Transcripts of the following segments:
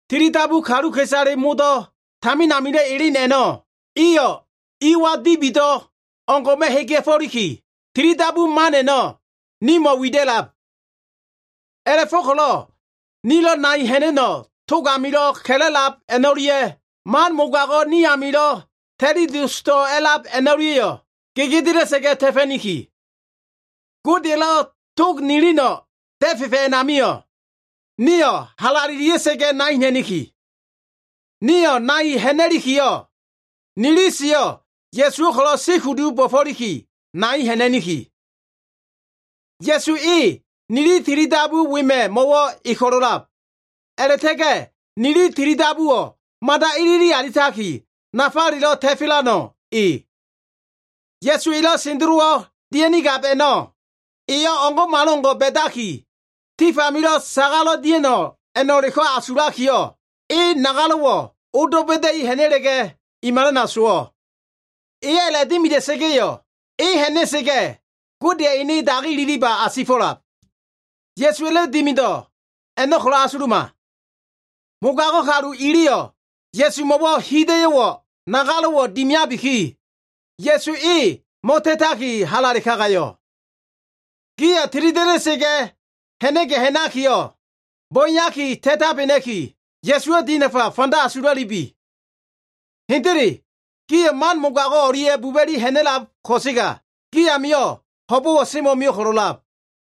Tilidabu kaluka꞉isale modo꞉ tamin amilo꞉ elen a꞉no꞉ iyo꞉ iwa dibido꞉ o꞉ngo꞉ma꞉ hegea꞉fo꞉liki, tilidabu man a꞉no꞉ nimo꞉ wida꞉lab. A꞉la꞉fo꞉ko꞉lo꞉ nilo꞉ nai ha꞉na꞉no꞉ tog amilo꞉ ka꞉la꞉lab a꞉no꞉lia꞉, man mogago꞉ ni amilo꞉ ta꞉li dosdo꞉ a꞉lab a꞉no꞉lia꞉yo꞉ gegedela꞉sa꞉ga꞉ ta꞉fa꞉niki. Godeya꞉lo꞉ tog nilino꞉ da꞉fefa꞉ a꞉namio꞉, nio꞉ halalelia꞉sa꞉ga꞉ nai ha꞉na꞉niki. Nio꞉ nai ha꞉na꞉likiyo꞉, nili siyo꞉ Ya꞉suwo꞉ ko꞉lo꞉ si kudu bo꞉fo꞉liki nai ha꞉na꞉niki. Ya꞉su e nili tilidabu wema꞉ mo꞉wo꞉ e ko꞉lo꞉ a꞉lab, a꞉la꞉ta꞉ga꞉ nili tilidabuwo꞉ mada ilili alitaki, nafalelo꞉ ta꞉fa꞉lano꞉ e. Ya꞉su elo꞉ sendelowo꞉ dia꞉nigab a꞉no꞉ eyo꞉ o꞉ngo꞉malo꞉ngo꞉ ba꞉daki, tif amilo꞉ sagalo꞉ dia꞉no꞉ a꞉no꞉leko꞉ asulakiyo꞉, e nagalo꞉wo꞉ odo꞉ ba꞉da꞉i ha꞉na꞉la꞉ga꞉, i malana sowo꞉. Eyo꞉ a꞉la꞉dimida꞉sa꞉ga꞉yo꞉, e ha꞉na꞉sa꞉ga꞉ Godeya꞉ ene dagi ililiba asifo꞉lab. Ya꞉suwa꞉lo꞉ dimido꞉ a꞉no꞉ ko꞉lo꞉ asuluma. Mogago꞉ kalu iliyo꞉ Ya꞉sumo꞉wo꞉ hida꞉yo꞉ nagalo꞉wo꞉ dimiabiki, Ya꞉su e mo꞉ta꞉taki halale kagayo꞉. Gio꞉ tilida꞉da꞉sa꞉ga꞉ ha꞉na꞉ga꞉ ha꞉nakiyo꞉, bo꞉eyaki ta꞉tabena꞉ki, Ya꞉suwo꞉ dinafa fanda asula꞉lubi. Hendele gio꞉ man mogago꞉ o꞉lia꞉ buba꞉li ha꞉na꞉lab ko꞉sega, gi amio꞉ ho꞉bo꞉wo꞉ semo꞉mio꞉ ko꞉lo꞉lab.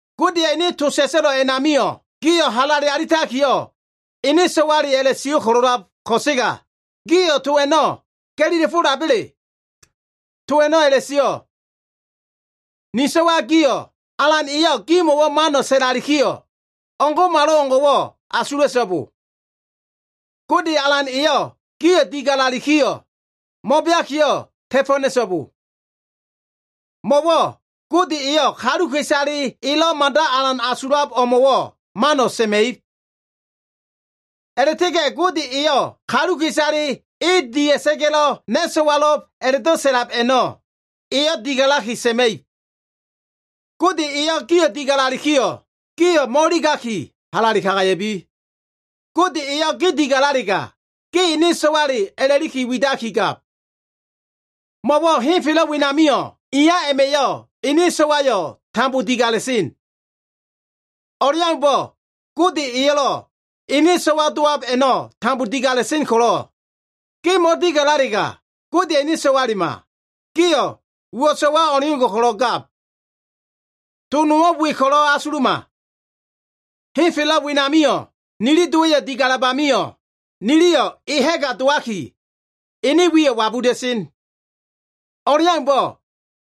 Godeya꞉ ene to sa꞉sa꞉lo꞉ a꞉namio꞉, gi ko꞉lo꞉ halale alitakiyo꞉ ene so꞉wale a꞉la꞉sio꞉ ko꞉lo꞉lab ko꞉sega, gio꞉ to a꞉no꞉ ga꞉lila꞉ fo꞉laba꞉le? To a꞉no꞉ a꞉la꞉sio꞉, “Ni so꞉wa gio꞉, Alan eyo꞉ gimo꞉wo꞉ mano꞉ sa꞉lalikiyo꞉, o꞉ngo꞉malo꞉ngo꞉wo꞉ asula꞉so꞉bo. Gode Alan eyo꞉ gio꞉ digalalikiyo꞉, mo꞉beakiyo꞉ ta꞉fo꞉ ha꞉na꞉so꞉bo. Mo꞉wo꞉ Gode eyo꞉ kaluka꞉isale elo꞉ mada alan asulab o꞉mo꞉wo꞉, mano꞉ sa꞉ma꞉ib. A꞉la꞉ta꞉ga꞉ Gode eyo꞉ kaluka꞉isaleyo꞉ e dia꞉sa꞉ga꞉lo꞉ ‘na꞉ so꞉walo꞉b’ a꞉la꞉do꞉ sa꞉lab a꞉no꞉, eyo꞉ digalaki sa꞉ma꞉ib.” Gode eyo꞉ gio꞉ digalalikiyo꞉, gio꞉ mo꞉iligaki, halale kagaya꞉bi. Gode eyo꞉ ge digalalega, ge ene so꞉wale a꞉la꞉li widakigab. Mo꞉wo꞉ henfelo꞉ wenamio꞉, iya a꞉ma꞉yo꞉ ene so꞉waleyo꞉ tambo digala꞉sen. O꞉leaumbo꞉ Gode eyo꞉lo꞉ ene so꞉wale dowab a꞉no꞉ tambo digala꞉sen ko꞉lo꞉, ge mo꞉digalalega, Godeya꞉ ene so꞉walema, gio꞉ uwo꞉ so꞉wa o꞉ngo꞉ ko꞉lo꞉ gab. To nowo꞉ we ko꞉lo꞉ asuluma. Henfelo꞉ wenamio꞉ nili dowa꞉yo꞉ digalab amio꞉, niliyo꞉ e ha꞉ga dowaki, ene wiyo꞉ wabuda꞉sen. O꞉leaumbo꞉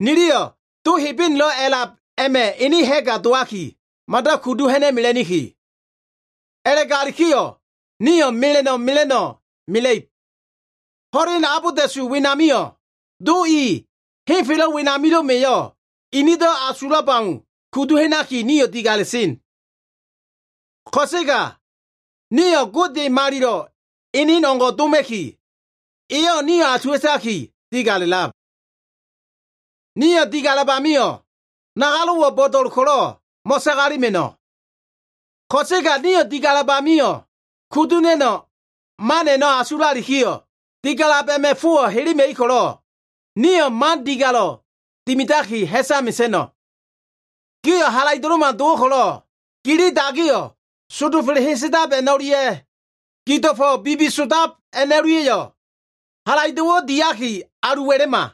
niliyo꞉ Do Hebenelo꞉ a꞉lab a꞉ma꞉ ene ha꞉ga dowaki, mada kudu ha꞉na꞉mela꞉niki. A꞉la꞉galikiyo꞉ nio꞉ mela꞉no꞉ mela꞉no꞉ mela꞉ib. Ho꞉len abolda꞉su wenamio꞉, do i henfelo꞉ wenamilo꞉ma꞉yo꞉ inido꞉ asulab au kudu ha꞉naki nio꞉ digala꞉sen. Ko꞉sega nio꞉ Gode malilo꞉ enen o꞉ngo꞉ doma꞉ki, eyo꞉ nio꞉ asuwa꞉taki digala꞉lab. Nio꞉ digalab amio꞉, nagalo꞉wo꞉ bo꞉do꞉l ko꞉lo꞉ mo꞉sagalema꞉no꞉. Ko꞉sega nio꞉ digalab amio꞉ kudu ha꞉na꞉no꞉ man a꞉no꞉ asulalikiyo꞉, digalab a꞉ma꞉ fowo꞉ helema꞉ib ko꞉lo꞉, nio꞉ man digalo꞉ dimidaki ha꞉sa mesa꞉no꞉. Gio꞉ halaido꞉lo꞉ma dowo꞉ ko꞉lo꞉, gili dagiyo꞉ sondofa꞉le hesedab a꞉no꞉lia꞉ gido꞉fo꞉wo꞉ bibisodab a꞉no꞉lia꞉yo꞉ halaido꞉wo꞉ diaki alu wa꞉la꞉ma.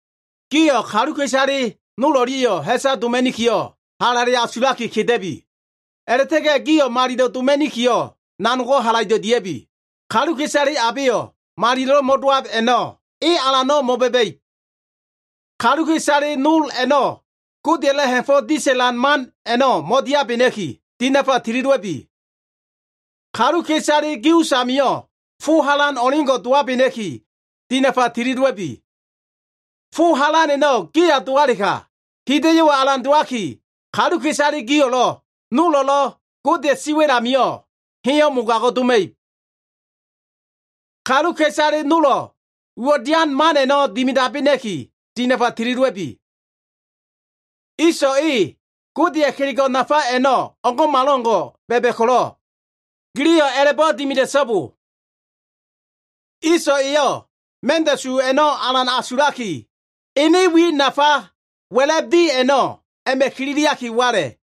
Gio꞉ kaluka꞉isale nol o꞉lia꞉yo꞉ ha꞉sa doma꞉nikiyo꞉, halale asulaki keda꞉bi. A꞉la꞉ta꞉ga꞉ gio꞉ malilo꞉ doma꞉nikiyo꞉, nanogo꞉ halaido꞉ dia꞉bi. Kaluka꞉isale abeyo꞉ malilo꞉lo꞉ mo꞉dowab a꞉no꞉, e Alano꞉ mo꞉ba꞉ba꞉ib. Kaluka꞉isale nol a꞉no꞉ Godeya꞉lo꞉ ha꞉fo꞉ disa꞉lan man a꞉no꞉ mo꞉diabena꞉ki, dinafa tili dowa꞉bi. Kaluka꞉isale gi usamio꞉ fo halan o꞉leo꞉ngo꞉ dowabena꞉ki, dinafa tili dowa꞉bi. Fo halan a꞉no꞉ giya dowalega, hida꞉yo꞉wo꞉ alan dowaki, kaluka꞉isale gio꞉lo꞉, nolo꞉lo꞉ Godeya꞉ siwa꞉l amio꞉ heyo꞉ mogago꞉ doma꞉ib. Kaluka꞉isale nolo꞉ uwo꞉ dian man a꞉no꞉ dimidabena꞉ki, dinafa tili dowa꞉bi. Iso꞉ e Godeya꞉ kelego꞉ nafa a꞉no꞉ o꞉ngo꞉malo꞉ngo꞉ ba꞉ba꞉ ko꞉lo꞉, giliyo꞉ a꞉la꞉bo꞉ dimida꞉so꞉bo. Iso꞉ eyo꞉ ma꞉nda꞉su a꞉no꞉ alan asulaki, ene wi nafa wa꞉la꞉b di a꞉no꞉ a꞉ma꞉ kililiaki wala꞉.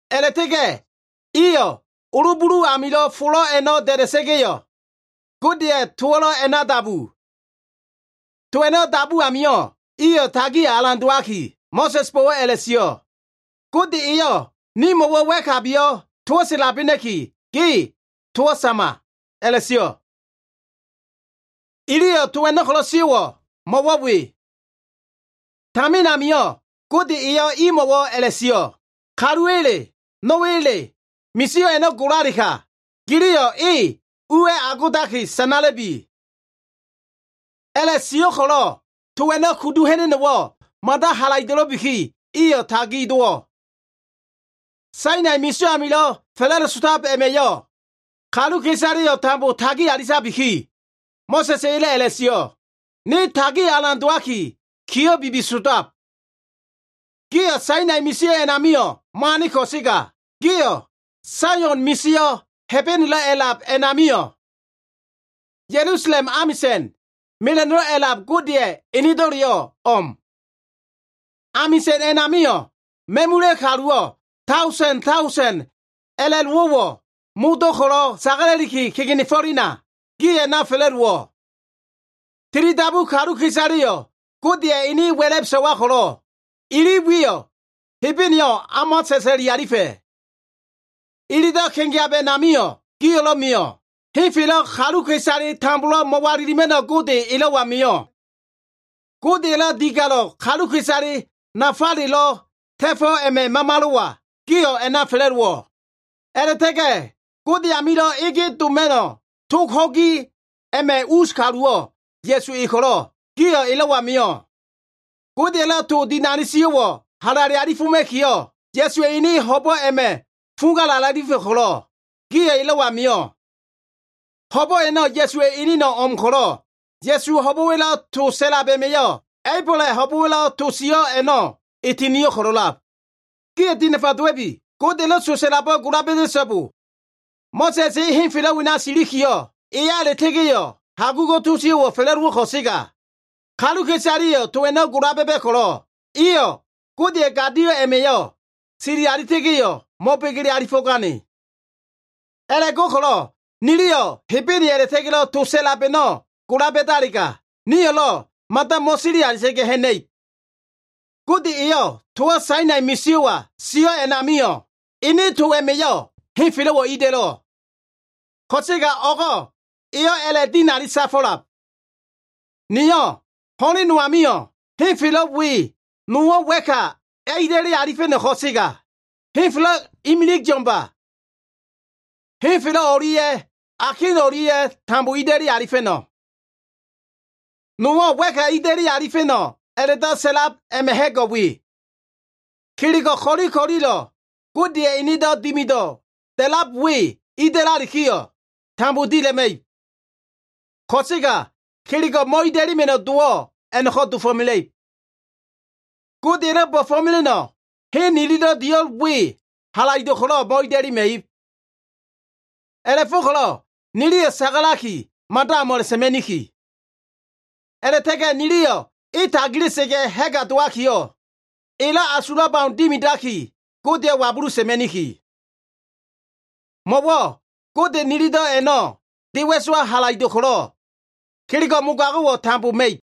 A꞉la꞉ta꞉ga꞉ iyo꞉ olo bulu amilo꞉ folo꞉ a꞉no꞉ da꞉da꞉sa꞉ga꞉yo꞉, Godeya꞉ towo꞉lo꞉ a꞉na dabu. To a꞉no꞉ dabu amio꞉, iyo꞉ tagi alan dowaki, Mo꞉sa꞉sbo꞉wo꞉ a꞉la꞉sio꞉, “Gode eyo꞉ nimo꞉wo꞉ wa꞉kabiyo꞉ towo꞉ sa꞉labena꞉ki, ge towo꞉ sama” a꞉la꞉sio꞉. Iliyo꞉ to a꞉no꞉ ko꞉lo꞉ sio꞉wo꞉ mo꞉wo꞉ we. Tamin amio꞉ Gode eyo꞉ imo꞉wo꞉ a꞉la꞉sio꞉, “Kaluwa꞉le, no꞉wa꞉le misio꞉ a꞉no꞉ golalega, giliyo꞉ e uwa꞉ agodaki sanala꞉bi.” A꞉la꞉sio꞉ ko꞉lo꞉ to a꞉no꞉ kudu ha꞉na꞉no꞉wo꞉ mada halaido꞉lo꞉biki iyo꞉ tagi dowo꞉. Sainai misio꞉ amilo꞉ fa꞉la꞉dosotab a꞉ma꞉yo꞉ kaluka꞉isaleyo꞉ tambo tagi alitabiki, Mo꞉sa꞉s eyo꞉lo꞉ a꞉la꞉sio꞉, “Ne tagio꞉ alan dowaki, kiyo꞉ bibisodab.” Gio꞉ Sainai misio꞉ a꞉namio꞉ mo꞉ane ko꞉sega, gio꞉ Saion misio꞉, Hebenelo꞉ a꞉lab a꞉na mio꞉. Ya꞉lusalem amisa꞉n, Mela꞉no꞉lo꞉ A꞉lab Godeya꞉ enedo꞉leyo꞉ o꞉m. Amisa꞉n a꞉namio꞉, ma꞉mula꞉ kaluwo꞉ daosen daosen a꞉la꞉lowo꞉wo꞉ modo꞉ ko꞉lo꞉ sagala꞉liki kegenefo꞉lena, gio꞉ a꞉na fa꞉la꞉dowo꞉. Tilidabu kaluka꞉isaleyo꞉ Godeya꞉ ene wa꞉la꞉b so꞉wa ko꞉lo꞉, ili wiyo꞉ Hebeneyo꞉ o꞉ma sa꞉sa꞉li alifa꞉. Ilido꞉ kegeab a꞉namio꞉ gio꞉lo꞉ mio꞉. Henfelo꞉ kaluka꞉isale tambolo꞉ mo꞉walilima꞉no꞉ Gode, elo꞉wa mio꞉. Godeya꞉lo꞉ digalo꞉ kaluka꞉isale nafalelo꞉ ta꞉fo꞉ a꞉ma꞉ Mamalo꞉wa, gio꞉ a꞉na fa꞉la꞉dowo꞉. A꞉la꞉ta꞉ga꞉ Gode amilo꞉ ege doma꞉no꞉ tog ho꞉gi a꞉ma꞉ us kaluwo꞉ Ya꞉su ko꞉lo꞉, gio꞉ elo꞉wa mio꞉. Godeya꞉lo꞉ to dinali sio꞉wo꞉ halale alifoma꞉kiyo꞉ Ya꞉suwa꞉ ene ho꞉bo꞉ a꞉ma꞉ fuga a꞉la꞉alifa꞉ ko꞉lo꞉, gio꞉ elo꞉wa mio꞉. Ho꞉bo꞉ a꞉no꞉ Ya꞉suwa꞉ eneno꞉ o꞉m ko꞉lo꞉, Ya꞉suwa꞉ ho꞉bo꞉wa꞉lo꞉ to sa꞉lab a꞉ma꞉yo꞉, A꞉ibola꞉ ho꞉bo꞉wa꞉lo꞉ to sio꞉ a꞉no꞉ e tinio꞉ ko꞉lo꞉lab. Gio꞉ dinafa dowa꞉bi. Godeya꞉lo꞉ to sa꞉labo꞉ gola ba꞉da꞉so꞉bo. Mo꞉sa꞉s e henfelo꞉ wena silikiyo꞉, eya a꞉la꞉ta꞉ga꞉yo꞉, hagugo꞉ to sio꞉wo꞉ fa꞉la꞉dowo꞉ ko꞉sega, kaluka꞉isaleya꞉yo꞉ to a꞉no꞉ gola ba꞉ba꞉ ko꞉lo꞉, iyo꞉ Godeya꞉ gadio꞉ a꞉ma꞉yo꞉ sili alita꞉ga꞉yo꞉, mo꞉begele alifo꞉gane. A꞉la꞉go꞉ko꞉lo꞉ niliyo꞉ Hebene a꞉la꞉ta꞉ga꞉lo꞉ to sa꞉lab a꞉no꞉ gola ba꞉dalega, nio꞉lo꞉ mada mo꞉sili alita꞉ga꞉ ha꞉na꞉ib. Gode eyo꞉ towo꞉ Sainai misio꞉wa sio꞉ a꞉namio꞉, ene to a꞉ma꞉yo꞉ henfelo꞉wo꞉ ida꞉lo꞉. Ko꞉sega o꞉go꞉ eyo꞉ a꞉la꞉dinali safo꞉lab, “Niyo꞉ ho꞉len no amio꞉ henfelo꞉ we nowo꞉ wa꞉ka ida꞉li alifa꞉no꞉ ko꞉sega, henfelo꞉ imilig yo꞉mba. Henfelo꞉ o꞉lia꞉ akin o꞉lia꞉ tambo ida꞉li alifa꞉no꞉.” Nowo꞉ wa꞉ka ida꞉li alifa꞉no꞉ a꞉la꞉do꞉ sa꞉lab a꞉ma꞉ ha꞉go꞉ we. Kelego꞉ ko꞉li ko꞉lilo꞉ Godeya꞉ enedo꞉ dimido꞉ da꞉lab we ida꞉lalikiyo꞉, tambo dila꞉ma꞉ib. Ko꞉sega kelego꞉ mo꞉ida꞉lema꞉no꞉ dowo꞉ a꞉no꞉ko꞉ dofo꞉mela꞉ib. Godeya꞉lo꞉ bo꞉fo꞉mela꞉no꞉ hen nililo꞉ dio꞉l we halaido꞉ ko꞉lo꞉ mo꞉ida꞉lema꞉ib. A꞉la꞉fo꞉ko꞉lo꞉ niliyo꞉ sagalaki, mada o꞉m a꞉la꞉sa꞉ma꞉niki. A꞉la꞉ta꞉ga꞉ niliyo꞉ e tagila꞉sa꞉ga꞉ ha꞉ga dowakiyo꞉, elo꞉ asulab au dimidaki, Godeyo꞉ wabulu sa꞉ma꞉niki. Mo꞉wo꞉ Gode nilido꞉ a꞉no꞉ de wa꞉sowa halaido꞉ ko꞉lo꞉, kelego꞉ mogago꞉wo꞉ tambo ma꞉ib.